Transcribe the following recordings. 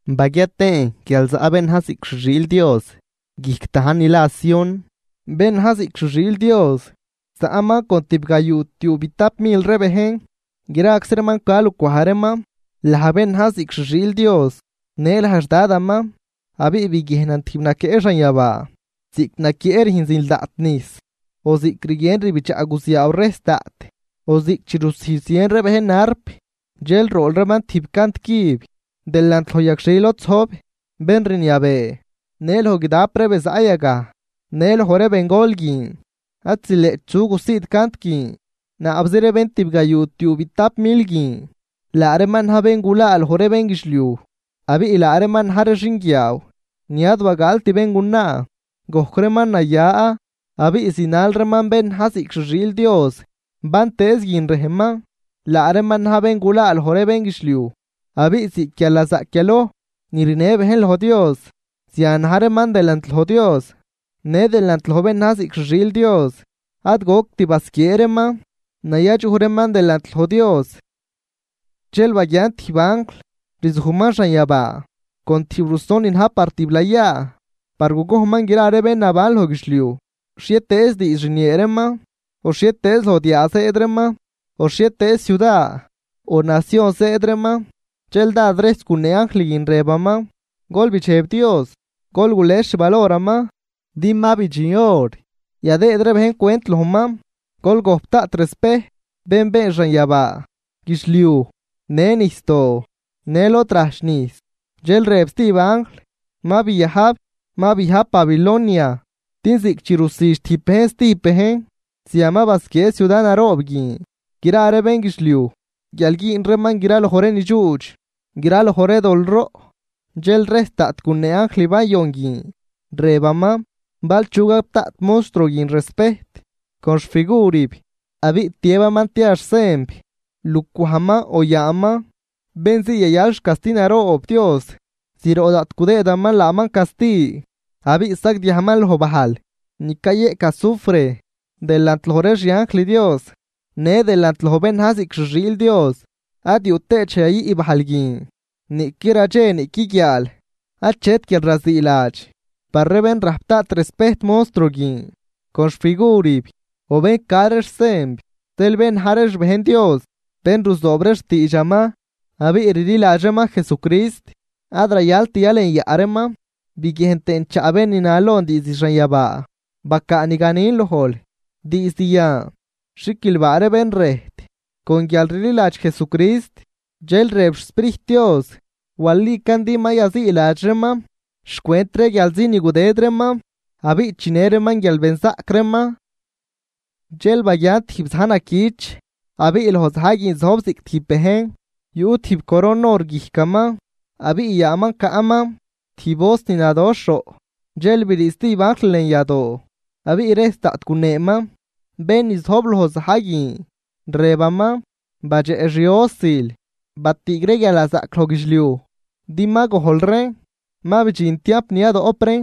Baguia tëën guial zaꞌ bén na̱j ziꞌc xi xiil Dios guijc dajn ni la Sión. Bén na̱j ziꞌc xi xiil Dios zaꞌman con tibgayuu tiuubitap mil ree bejn, graczi reeman ca lucwaj reeman laj bén na̱j ziꞌc xi xiil Dios në laj xDadaman. Abiꞌ biguiejnan tijb naquieꞌ xanyabaa ziꞌc naquieꞌ rüjn zil daꞌt nijs, o ziꞌc rguien rbidxaꞌ guziaaw rejs daꞌt, o ziꞌc chi rusijdx zien ree bejn arp. Dxel rool reeman tijb cant cüb delant loj yagxhil lod zojb bén rniabee në loj guidap ree be zaꞌ yagaj në loj ree bengol guin. Ad zileꞌt chu gusiid cant guin, naabzi ree bén tibgayuu tiuubitap mil guin, laa reeman na̱j bén gulaa loj ree bénguidxliuj. Abiꞌ laa reeman na̱j ree xinguiaaw ni ad bagaalt béngunaa, gojc reeman naya abiꞌ zinal reeman bén na̱j ziꞌc xi xiil Dios bantëëz guin rejman. Laa reeman na̱j ree bén gulaa loj ree bénguidxliuj abiꞌ ziꞌc guialnazaꞌc yaloj ni rinë bejn loj Dios zian na̱j reeman delant loj Dios në delant loj bén na̱j ziꞌc xi xiil Dios. Ad goct basquiee reeman, nayadxuj reeman delant loj Dios. Dxel baguian tijb anjl rzujman xanyabaa con tijb ruson ni na̱j par tiblayaa par gugojnman gra ree bén naban loj guidxliuj, xhietëëz diidx rniee reeman, o xhietëëz loj diaa zëëd reeman, o xhietëëz ciuda o nacion zëëd reeman. Dxel dád rejs gunee anjl guin rëbaman: ―Gol bidxeb Dios, gol gules xvaloraman, din ma bidxin hor yadëëd ree bejn cwent lojman. Gol gojp daꞌt respejt bén been xanyabaa, guidxliuj në nijsdoo në lod rajch nijs. Dxel rëb stijb anjl: ―Ma biajb, ma biajb Babilonia din ziꞌc chi rusüdx tijb bejn stijb bejn, zian ma basquiee ciuda naroob guin gra ree bénguidxliuj guial güün reeman graloj ree nidxuudx, graloj ree dol roꞌ. Dxel rejs daꞌt gunee anjl bayon guin rëbaman: ―Bal chu gap daꞌt monstruo guin respejt con xfigurib abiꞌ tiëbaman tia xsenb lucwajman o yaaman, bén zii yayal xcasti naroob Dios, zroꞌ daꞌt gudëëdaman laaman casti. Abiꞌ sagdiajman loj bajl ni cayeꞌc azufre delant loj ree xianjl Dios në delant loj bén na̱j ziꞌc xi xiil Dios. Ad yuꞌ tëët dxej yayüꞌ bajl guin. Niꞌqui radxe niꞌqui guiaal achet guialraziiladx par ree bén rajp daꞌt respejt monstruo guin con xfigurib, o bén ca ree xsenb. Zeel bén na̱j ree xbejn Dios bén ruzoob ree xtiidxaman abiꞌ rliladx reeman Jesucrist, ad rayalt yalenyaꞌ reeman. Biguiejn tëën chaꞌ bén ni na lon diizd xanyabaa: ―Bacaa ni ganin lojl: “Diizd yan xiquilbaa ree bén rëjt con guialrliladx Jesucrist.” Dxel rëb xSprijt Dios: “Walican din ma yaziiladx reeman xcwent ree guialzi ni gudëd reeman abiꞌ chinë reeman guialbenzaꞌc reeman.” Dxel baguian tijb za̱j naquich abiꞌ loj za̱j guin zojb ziꞌc tijb bejn. Yuꞌ tijb coron or guijcaman abiꞌ yaaman caꞌman tijb hoz ni nadoxh roꞌ. Dxel brii stijb anjl lën yadoo abiꞌ rejs daꞌt guneeman bén ni zojb loj za̱j guin rëbaman: ―Badxeꞌ xi hosil, batüüg ree guialnazaꞌc loj guidxliuj din ma gojl reen ma bidxin tiamp ni yadoꞌp reen.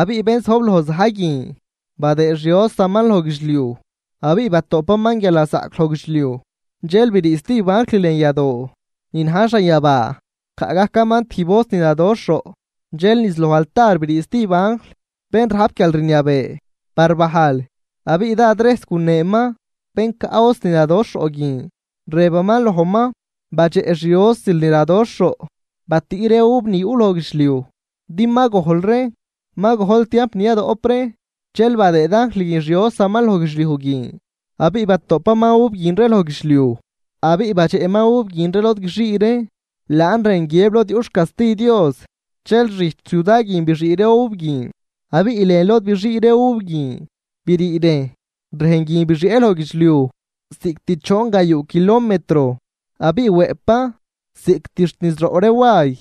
Abiꞌ bén zojb loj za̱j guin badëëd xi hosaman loj guidxliuj abiꞌ batoꞌpaman guialnazaꞌc loj guidxliuj. Dxel brii stijb anjl lën yadoo ni na̱j xanyabaa, caꞌ gajcaman tijb hoz ni nadoxh roꞌ. Dxel niz loj altar brii stijb anjl bén rajp guialrniabee par bajl, abiꞌ dád rejs guneenëman bén caꞌ hoz ni nadoxh roꞌ guin, rëbaman lojman: ―Badxeꞌ xi hosil ni nadoxh roꞌ, batüꞌ ree uv ni yuꞌ loj guidxliuj din ma gojl reen ma gojl tiamp ni yadoꞌp reen. Dxel badëëd anjl guin xi hosaman loj guidxliuj guin, abiꞌ batoꞌpaman uv guin ree loj guidxliuj. Abiꞌ badxeꞌman uv guin ree lod guixii reen, laan rën guiëb lod yuꞌ xcasti Dios. Dxel xijch ciuda guin bixii ree uv guin abiꞌ lën lod bixii ree uv guin birii rejn. Rejn guin bixieꞌn loj guidxliuj ziꞌct choon gayuu kilometro abiꞌ wëꞌpan ziꞌct xt niz roꞌ ree way.